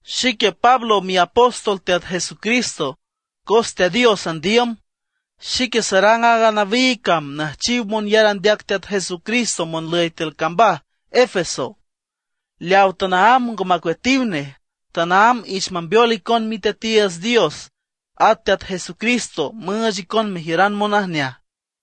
Xique Pablo miapóstol Teat Jesucristo, cos Teat Dios andiüm. Xique sarang aaga nawiig cam nüjchiw monyar andeac Teat Jesucristo monlüy tiül cambaj Efeso, leaw tanaámb ngo macueatiw nej. Tanaámb ich mambeol icon Miteatiiüts Dios at Teat Jesucristo müüch icon mejiüran monajneaj.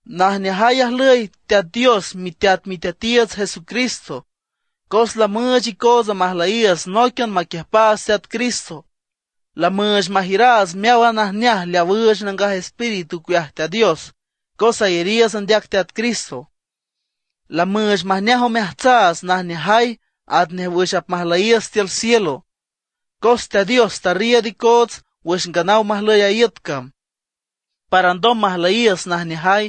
Najneajay ajlüy Teat Dios miteat Miteatiiüts Jesucristo, cos lamüüch icootsa majlüyiiüts nóiquian maquiüjpaats Teat Cristo. Lamüüch majiüraats meáwan najneaj leaw üüch Nangaj Espíritu ocueaj Teat Dios cos ayariiüts andeac Teat Cristo; lamüüch majneaj omeajtsaats najneajay atnej wüx apmajlüyiiüts tiül cielo. Cos Teat Dios tarriiüd icoots wüx nganaw majlüy a iüt cam, para alndom majlüyiiüts najneajay,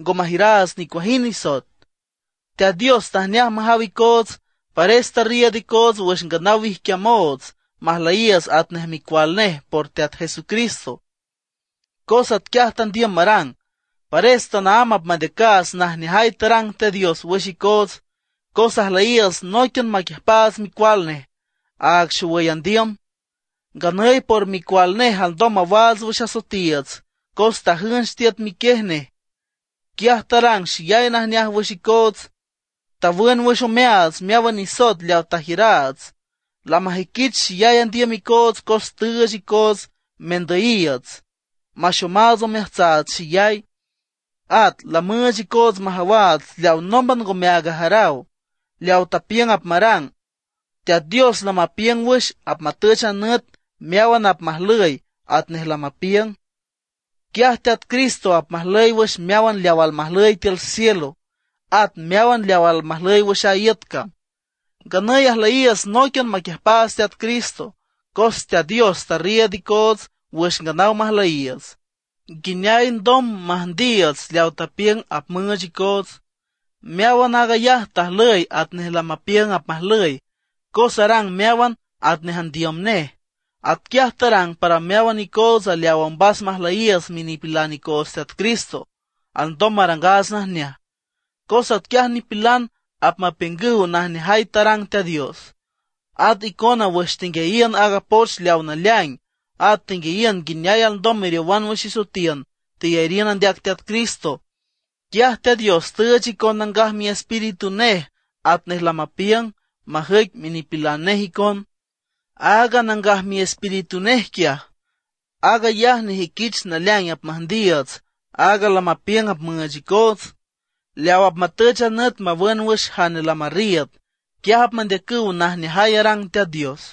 ngo majiüraats nicuajind nisoet. Teat Dios tajneaj majaw icoots, pares tarriiüd icoots wüx nganaw wijquiamoots, majlüyiiüts atnej micual nej por Teat Jesucristo, cos atquiaj tandiüm marang. Pares tanaámb apmandeacaats najneajay tarang Teat Dios wüx icoots, cos ajlüyiiüts nóiquian maquiüjpaats Micual nej, aag xowüy andiüm. Nganüy por micual nej alndom mawaats wüx asoetiiüts cos tajünch tiüt miquiej nej. Quiaj tarang xeyay najneaj wüx icoots; tawün wüx omeaats meáwan nisoet leaw tajiüraats. Lamajüiquich xeyay andiüm icoots cos tüüch icoots mendüyiiüts, maxomaats omeajtsaats xeyay; at lamüüch icoots majawaats leaw nómban ngomeaag ajaraw, leaw tapiüng apmarang. Teat Dios lamapiüng wüx apmatüch a nüt meáwan apmajlüy atnej lamapiüng. Quiaj Teat Cristo apmajlüy wüx meáwan leaw almajlüy tiül cielo, at meáwan leaw almajlüy wüx a iüt cam. Nganüy ajlüyiiüts nóiquian maquiüjpaats Teat Cristo, cos Teat Dios tarriiüd icoots wüx nganaw majlüyiiüts, nguineay alndom müjndiiüts leaw tapiüng apmüüch icoots. Meáwan aag ayaj tajlüy atnej lamapiüng apmajlüy, cos arang meáwan atnej andiüm nej. Atquiaj tarang para meáwan icootsa leawa ombas majlüyiiüts minipilan icoots Teat Cristo alndom marangaats najneaj, cos atquiaj nipilan apmapiüngüw najneajay tarang Teat Dios. At icona wüx tenguiayiün aaga poch leawa naleaing, at tenguiayiün nguineay alndom meriowan wüx isoetiün, teyariün andeac Teat Cristo. Quiaj Teat Dios tüüch icon Nangaj Miespíritu nej atnej lamapiüng, majüic minipilan nej icon. Aaga Nangaj Miespíritu nej quiaj, aag ayaj nejüiquich naleaing apmüjndiiüts aaga lamapiüng apmüüch icoots, leaw apmatüch a nüt mawün wüx jane lamarriiüd, quiaj apmandeacüw najneajay arang Teat Dios.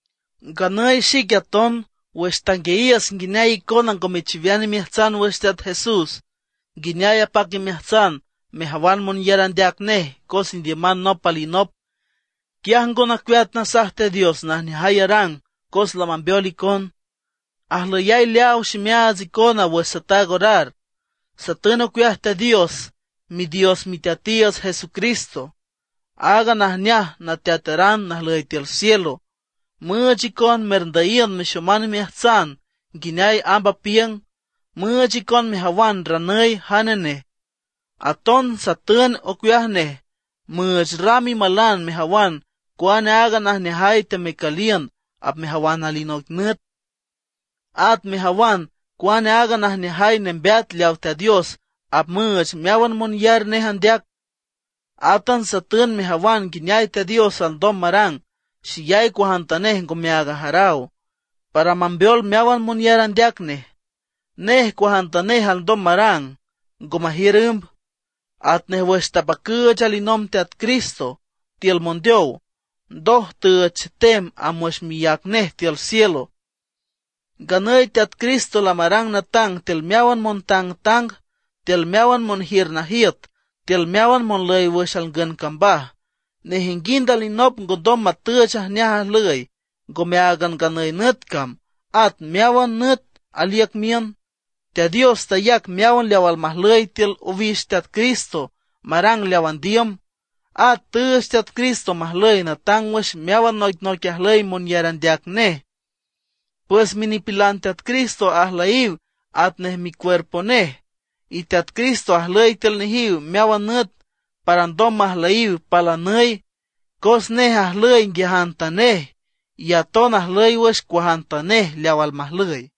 Nganüy xique aton, wüx tanguiayiüs nguineay icona ngo mechiwean imeajtsan wüx Teat Jesús, nguineay apac imeajtsan mejawan monyar andeac nej cos indiüman nop alinop, quiaj ngo nacueat nasaj Teat Dios najneajay arang cos lamambeol icon. Ajlüyay leaaw ximeaats icona wüx sataag orar. Satün ocueaj Teat Dios, Midios Miteatiiüts Jesucristo, aaga najneaj Nateataran najlüy tiül cielo, müüch icon merndüyiün mexoman imeajtsan nguineay amb apiüng, müüch icon mejawan ranüy jane nej. Aton satün ocueaj nej müüch ram imalan mejawan cuane aaga najneajay temecüliün apmejawan alinoic nüt, at mejawan cuane aaga najneajay nembeat leawa Teat Dios apmüüch meáwan monyar nej andeac. Átan satün mejawan nguineay Teat Dios alndom marang xeyay cuajantanej ngomeaag ajaraw, para mambeol meáwan monyar andeac nej. Nej cuajantanej alndom marang, ngo majiür ümb; atnej wüx tapacüüch alinomb Teat Cristo tiül mondeow, ndoj tüüch chetem amb wüx miác nej tiül cielo. Nganüy Teat Cristo lamarang natang tiül meáwan montangtang, tiül meáwan monjiür najiüt, tiül meáwan monlüy wüx alngün cambaj. Nejinguind alinop ngondom matüch ajneaj ajlüy, ngome áagan nganüy nüt cam, at meáwan nüt aliüc miün. Teat Dios tayac meáwan leaw almajlüy tiül owix Teat Cristo marang wüx leaw andiüm. At tüüch Teat Cristo majlüy natang wüx meáwan noicnoic ajlüy monyar andeac nej. Pues minipilan Teat Cristo ajlüyiw atnej micuerpo nej, y Teat Cristo ajlüy tiül nejiw meáwan nüt para ndom majlüyiw palanüy, cos nej ajlüy nguiajantanej, y aton ajlüy wüx cuajantanej leaw almajlüy.